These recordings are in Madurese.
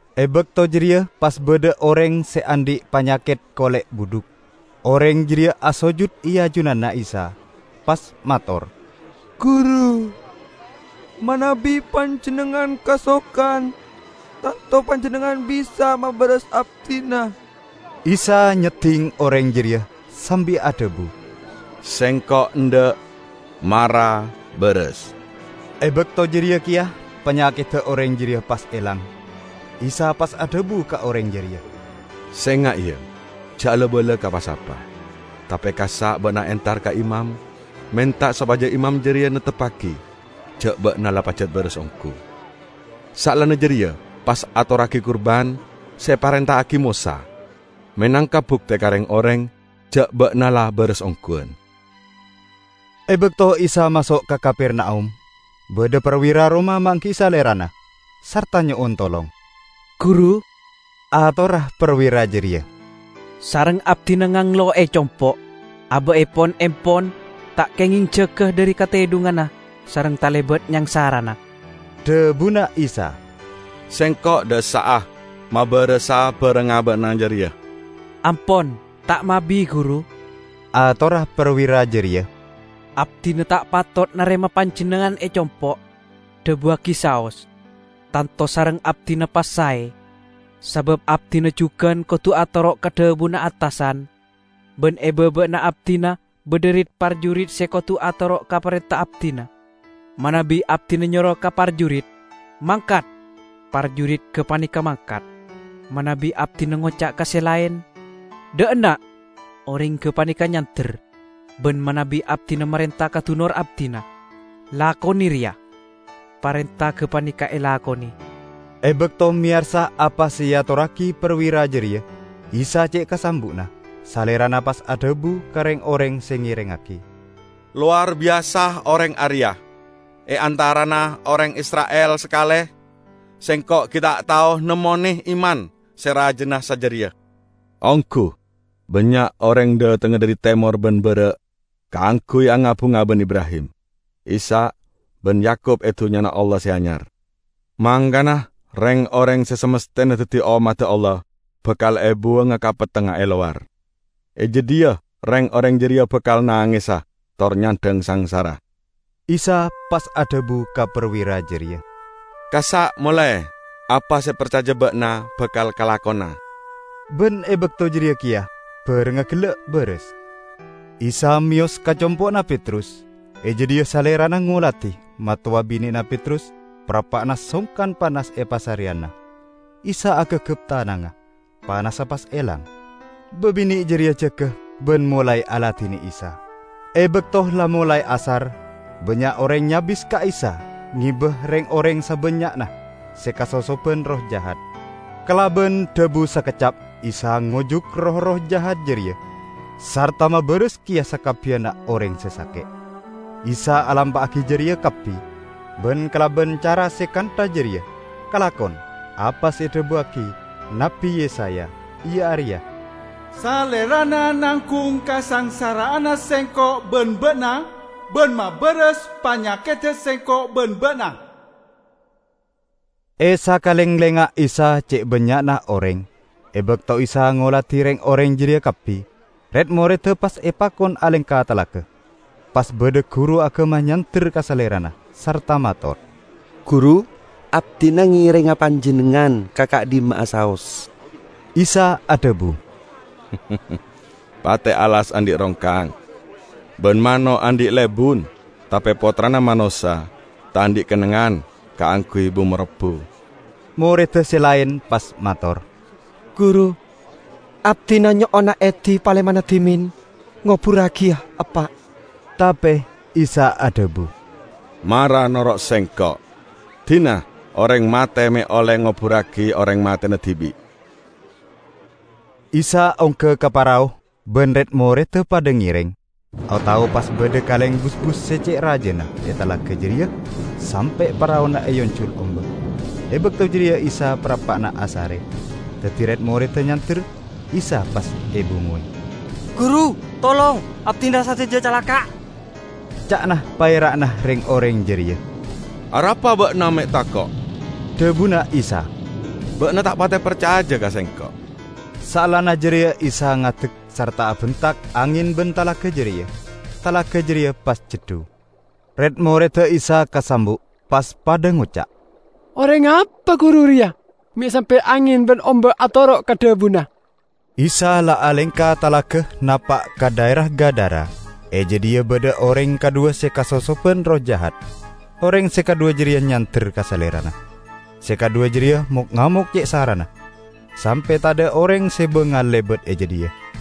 E bakto jareya pas badha oreng se andhi' panyaket kole' budhuk. Oreng jareya asojud e ajunanna Isa, pas mator, "Guru, manabi Panjennengngan kasokan, tanto Panjennengngan bisa mabaras abdina." Isa nyedding oreng jareya sambi adhabu, "Sengko' endha'. Mara, baras!" E bakto jareya keya panyakedda oreng jareya pas elang. Isa pas adhabu ka oreng jareya, "Senga', ya! Ja' ala-bala ka pa-sapa. Tape kassa' ba'na entar ka imam, menta sopaja imam jareya neptebbagi ja' ba'na la pajat baras onggu. Saellana jareya pas atorragi kurban se eparenta'agi Mosa, menangka bukte ka reng-oreng ja' ba'na la baras ongguwan!" E bakto Isa maso' ka Kapernaum, badha parwira Roma manggi'i Salerana, sarta nyo'on tolong. "Guru," atorra parwira jareya, "sareng abdina nganglo e compo'. Aba'epon empon, ta' kengeng jaga dhari katedhunganna sareng talebat nyangsarana." Dhabuna Isa, "Sengko' dha' essa'a mabarasa barengnga ba'na jareya." "Ampon, ta' mabi Guru," atorra parwira jareya, "Abdina ta' patot narema Panjennengngan e compo'. Dhabuwagi saos. Tanto sareng abdina pas sae. Sabab abdina jugan kodu atoro' ka dhabuna attasan. Ban e baba'anna abdina badha rit-parjurit se kodu atoro' ka parenta abdina. Manabi abdina nyoro ka parjurit, 'Mangkat!' parjurit gapaneka mangkat. Manabi abdina ngoca' ka se laen, 'Dha' enna'!' oreng gapaneka nyander; ban manabi abdina marenta ka dunor abdina, 'Lakone reya!' parenta gapaneka elakone." E bakto meyarsa apa se eatorragi parwira jareya, Isa ce' kasambu'na. Salerana pas adhabu ka reng-oreng se ngerengngagi, "Lowar biyasa oreng areya. E antarana oreng Isra'il sakale Sengko' gi' ta' tao nemmone iman se rajana sajareya! Onggu! Bannya' oreng dhatengnga dhari temor ban bara' kaangguy anga-bunga ban Ibrahim, Ishak ban Yakub e Dunnyana Allah se Anyar. Mangkana reng-oreng se samasthena daddi ommadda Allah bakal ebuwanga ka pettengnga e lowar. E jadhiya reng-oreng jareya bakal nangesa tor nyandhang sangsara." Isa pas adhabu ka parwira jareya, "Kassa' mole, apa se eparcaja ba'na bakal kalakona." Ban e bakto jareya keya barengnga gella' baras. Isa meyos ka compo'na Petrus. E jadhiya Salerana ngoladi mattowa bine'na Petrus parappa'na songkan panas e pasareyanna. Isa agagap tanangnga, panassa pas elang. Babine' jareya jaga ban molae aladine Isa. E bakto la molae asar, bannya' oreng nyabis ka Isa ngeba reng-oreng sabannya'na se kasosoban erroh jahat. Kalaban dhabu sakeccap Isa ngojuk roh-erroh jahat jareya sarta mabaras keya sakabbiyanna oreng se sake'. Isa alampa'agi jareya kabbi, ban kalaban cara se kantha jareya kalakon apa se edhabuwagi Nabbi Yesaya, iya areya, "Salerana nanggung kasangsara'anna sengko' ban ba'na ban mabaras panyakedda sengko' ban ba'na." E sakalenglengnga Isa ce' bannya'na oreng. E bakto Isa ngoladi reng-oreng jareya kabbi, red-moredda pas epakon alengka talaga. Pas badha guru agama nyander ka Salerana sarta mator, "Guru, abdina ngerenga Panjennengngan ka ka'dhimma'a saos." Isa adhabu, "Pate' alas andhi' rongkang, ban mano' andhi' lebun, tape Pottrana Manossa ta' andhi' kennengngan kaangguy bu-marobbu." Moredda se laen pas mator, "Guru, abdina nyo'ona edi palemana dhimen ngoburragiya eppa'." Tape Isa adhabu, "Mara noro' Sengko', dina oreng mate me' olle ngoburragi oreng matena dibi'." Isa ongga ka parao ban red-moredda padha ngereng. O-tao pas badha kaleng busbus se ce' rajana e talaga jareya sampe' paraona eanjul omba'. E bakto jareya Isa parappa'na asare. Daddi red-moredda nyander, Isa pas ebungowe. "Guru! Tolong! Abdina sadaja calaka'!" ca'na paera'na reng-oreng jareya. "Arapa ba'na me' tako'?" dhabuna Isa. "Ba'na ta' pate parcaja ka Sengko'!" Saellana jareya Isa ngadek sarta abentak angen ban talaga jareya. Talaga jareya pas ceddu. Red-moredda Isa kasambu'. Pas padha ngoca', "Oreng apa Guru reya, me' sampe' angen ban omba' atoro' ka dhabuna!" Isa la alengka talaga napa' ka dhaera Gadara. E jadhiya badha oreng kadhuwa se kasosoban erroh jahat; oreng se kadhuwa jareya nyander ka Salerana. Se kadhuwa jareya mok-ngamok ce' sarana sampe' tadha' oreng se bangal lebat e jadhiya.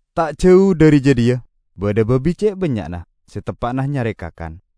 Ta' jau dhari jadhiya badha babi ce' bannya'na se teppa'na nyare kakan.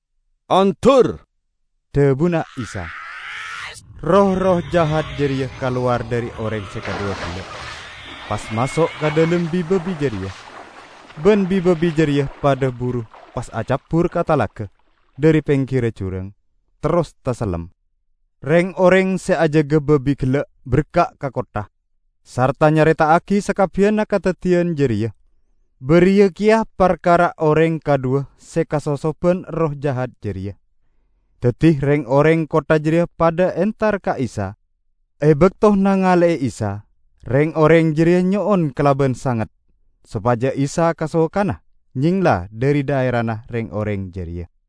"Ondur!" dhabuna Isa. Roh-erroh jahat jareya kalowar dhari oreng se kadhuwa gella', pas maso' ka dhalem bi-babi jareya. Ban bi-babi jareya padha buru pas acabbur ka talaga dhari penggirra jurang, terros tasellem. Reng-oreng se ajaga babi gella' berka' ka kottha, sarta nyareta'agi sakabbiyanna kadaddiyan jareya, bariya keya parkara oreng kadhuwa se kasosoban erroh jahat jareya. Daddi reng-oreng kottha jareya padha entar ka Isa. E bakto nangale'e Isa, reng-oreng jareya nyo'on kalaban sanget sopaja Isa kasokana nyengla dhari dhaerana reng-oreng jareya.